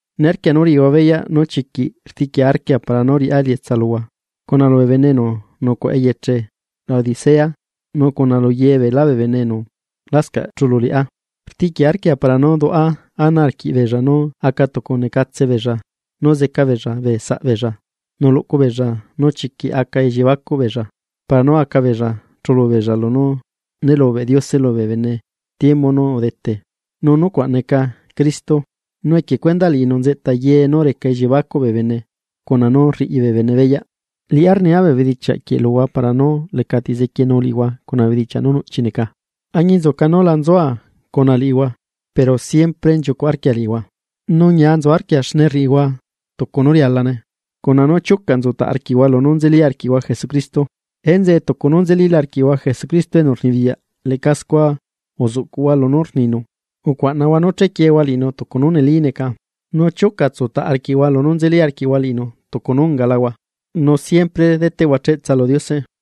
Niarquia nú riꞌihua beyaꞌ nú chiquiꞌ rtiꞌquia arquia para nú riꞌá elietsa luhua, cuna lubee bene enu nucuaꞌa eyeche Laodicea nu cuna lu ye beelá bee bene enu lascaꞌ chulu liꞌá. Rtiꞌquia arquia para nú duaꞌa ana arquiꞌbeella nú aca tucu necatsebeella nu zeca beella bee saꞌ beella nu luꞌcubeella nú chiquiꞌ aca elliebacuꞌ beella para nú aca beella chulu beella lunú nélubeꞌ Diose lubee bene tiembu nú udete, nú nucuaꞌ neca Cristo. Nu equie cuendaꞌ liꞌinu nzeꞌta ye nú reca elliiebacuꞌ bee bene, cuna nú rriꞌi bee bene beyaꞌ. Liꞌá rnia bee bedichiaꞌ quieꞌ luhua para nú lecati zequienu liꞌihua cuna bee bedichiaꞌ nú nuꞌchi neca. Añinzuca nú la nzua cuna liꞌihua, pero siempre nchiucuꞌ arquia liꞌihua, nu ñia nzu arquia xne rriꞌihua tucu nú rialane, cuna nú chiuca nzutaꞌ arquiꞌhua lunú nzeli arquiꞌhua Jesucristo. Enzeꞌe tucu nú nzelila arquiꞌhua Jesucristo enu rnibiyaꞌ leꞌca scua uzuꞌcuꞌhua lunú rninu, ucuaꞌnahua nú chequiehua liꞌinu tucu nú neli neca, nu chiuca utsutaꞌ arquiꞌhua lunú nzeli arquiꞌhua liꞌinu tucu nú ungalahua, nu siempre deꞌteꞌhua cheꞌtsa lu Diose.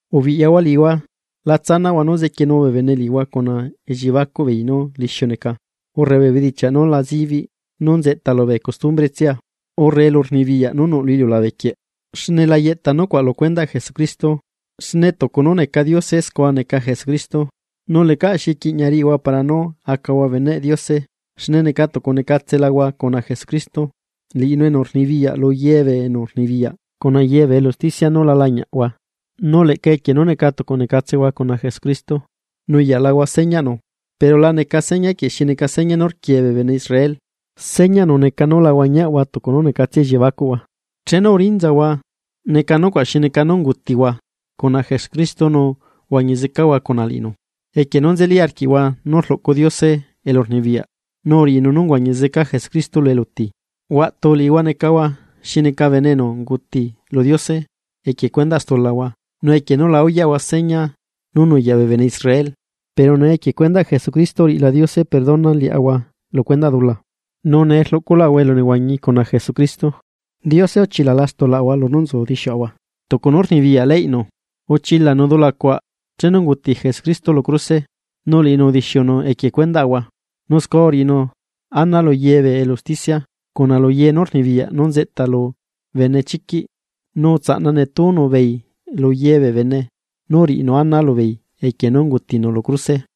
Ubiꞌyahua liꞌihua. La tsanaꞌhua nú zequienu bee bene liꞌihua cuna elliebacuꞌ beei nú lixiu neca, urre bee bedichiaꞌ nú la zibiꞌ nú nzeꞌta lubee costumbretsia, urre elurnibiyaꞌ nú nuꞌ lu iliulabe quieꞌ, xne la yeꞌta nucuaꞌ lu cuendaꞌ Jesucristo. Xne tucu nú neca Diose scua neca Jesucristo, nu lecaꞌ xi quiꞌña riꞌihua para nú acahua beneꞌ Diose xne neca tucu necatselahua cuna Jesucristo, liꞌinu enu rnibiyaꞌ lu ye bee enu rnibiyaꞌ cuna ye bee elu usticia nú la lañiaꞌahua. Nu leꞌca equie nú neca tucu necatsehua cuna Jesucristo, nuyaꞌlahua señaꞌnu, pero la neca seña quieꞌ xi neca seña nú rquiee bee bene Israel, señaꞌnu neca nú la huañiaꞌhua tucu nú necatsia elliebacuꞌhua. Chenu urinzahua, neca nucuaꞌ xi neca nú ungutihua cuna Jesucristo nu uhuañi zecahua cuna liꞌinu, equie nú nzeli arquiꞌhua nú rluꞌcu Diose poder nu uriꞌinu nú uhuañi zeca Jesucristo lu eluti. Huaꞌtu, liꞌihua necahua xi neca bene enu unguti lu Diose equie cuendaꞌ stulahua nu equie nú la uyaꞌhua seña nú nuyaꞌ bee bene Israel. Pero nee equie cuendaꞌ Jesucristo uriꞌila Diose perdona liaꞌahua lu cuendaꞌ stulaꞌahua, nu nee rluꞌculaꞌahua elunehuañi cuna Jesucristo. Diose uchilala stulaꞌahua lunú nzu dixiuꞌahua tucu nú rnibiyaꞌ leyꞌnu. Uchilanu dula cuaꞌ chenu unguti Jesucristo lu cruse. Nu liꞌinu udixiunu equie cuendaꞌahua. Nu scua uriꞌinu ana lu ye bee elu usticia, cuna lu ye nú rnibiyaꞌ nú nzeꞌta lu benechiquiꞌ. Nu utsaꞌna netúnu beei lu ye bee bene nu uriꞌinu ana lubeei equie nú ungutinu lu cruse.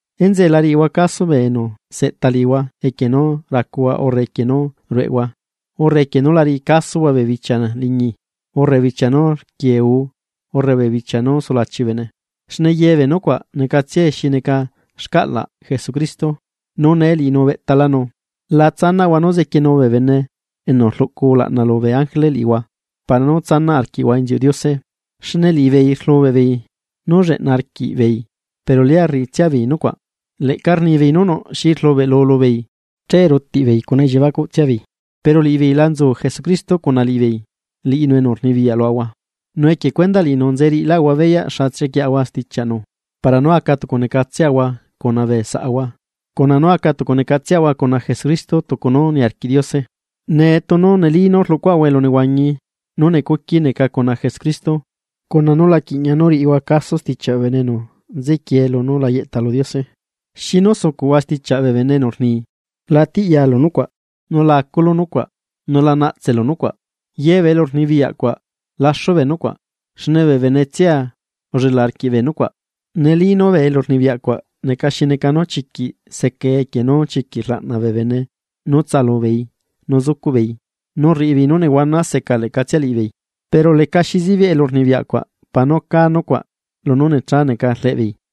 Enzeꞌe la riꞌihua caso bee enu seꞌta liꞌihua equie nú racuhua urre equie nú rueꞌehua, urre equie nú la riꞌi casohua bee bichia liñi, urre bichia nú rquiee guu urre bee bichia nú sulachi bee bene, xne ye bee nucuaꞌ necatsia xi neca xcaꞌlaꞌ Jesucristo, nu nee liꞌinu ubeꞌtalanu. La tsanaꞌhua nú zequienu bee enu rluꞌcu ulaꞌna lubee ángele liꞌihua para nú tsanaꞌ arquiꞌhua inziuꞌ Diose, xne liꞌibeei rlubeꞌbeei nú lleꞌna arquiꞌbeei pero lia rriꞌitsiabeei nucuaꞌ. Leꞌca rnibeei nú nuꞌ xi rlubeꞌlu lubeei, che rutiꞌbeei cuna elliebacuꞌ tsiaꞌbeei. Pero liꞌibeei la nzu Jesucristo cuna liꞌibeei, liꞌinu enu rnibiyaꞌ luaꞌahua. Nu equie cuendaꞌ liꞌinu nze riꞌilaꞌahua beyaꞌ xa chequieꞌahua stichiaꞌnu para nú aca tucu necatseꞌahua cuna bee saꞌahua, cuna nú aca tucu necatsehua cuna Jesucristo tucu nú niarquiꞌ Diose. Nee tunu neli nú rluꞌcuhua elunehuañi nú necuqui neca cuna Jesucristo, cuna nú la quiꞌña nú riꞌihua caso stichiaꞌ bee bene enu nzequiee lunú la yeꞌta lu Diose. ¿Xinu sucuꞌhua stichiaꞌ bee bene enu rni: “La tiꞌyalu nucuaꞌ. Nu la aculu nucuaꞌ, nu la naꞌtselu nucuaꞌ”? Ye bee elu rnibiyaꞌcua laxu bee nucuaꞌ, xne bee benetsia ullela arquiꞌ bee nucuaꞌ. Neli nú bee elurnibiyaꞌ cuaꞌ neca xi neca nú chiquiꞌ secae equie nú chiquiꞌ rlaꞌna bee bene nú tsaꞌalubeei nu sucuꞌbeei nu rriꞌibeei nú nehuana seca leꞌcatsia liꞌibeei, pero lecaxi zibiꞌ elurnibiyaꞌ cuaꞌ para nú cá nucuaꞌ lunú necha neca rleꞌbeei.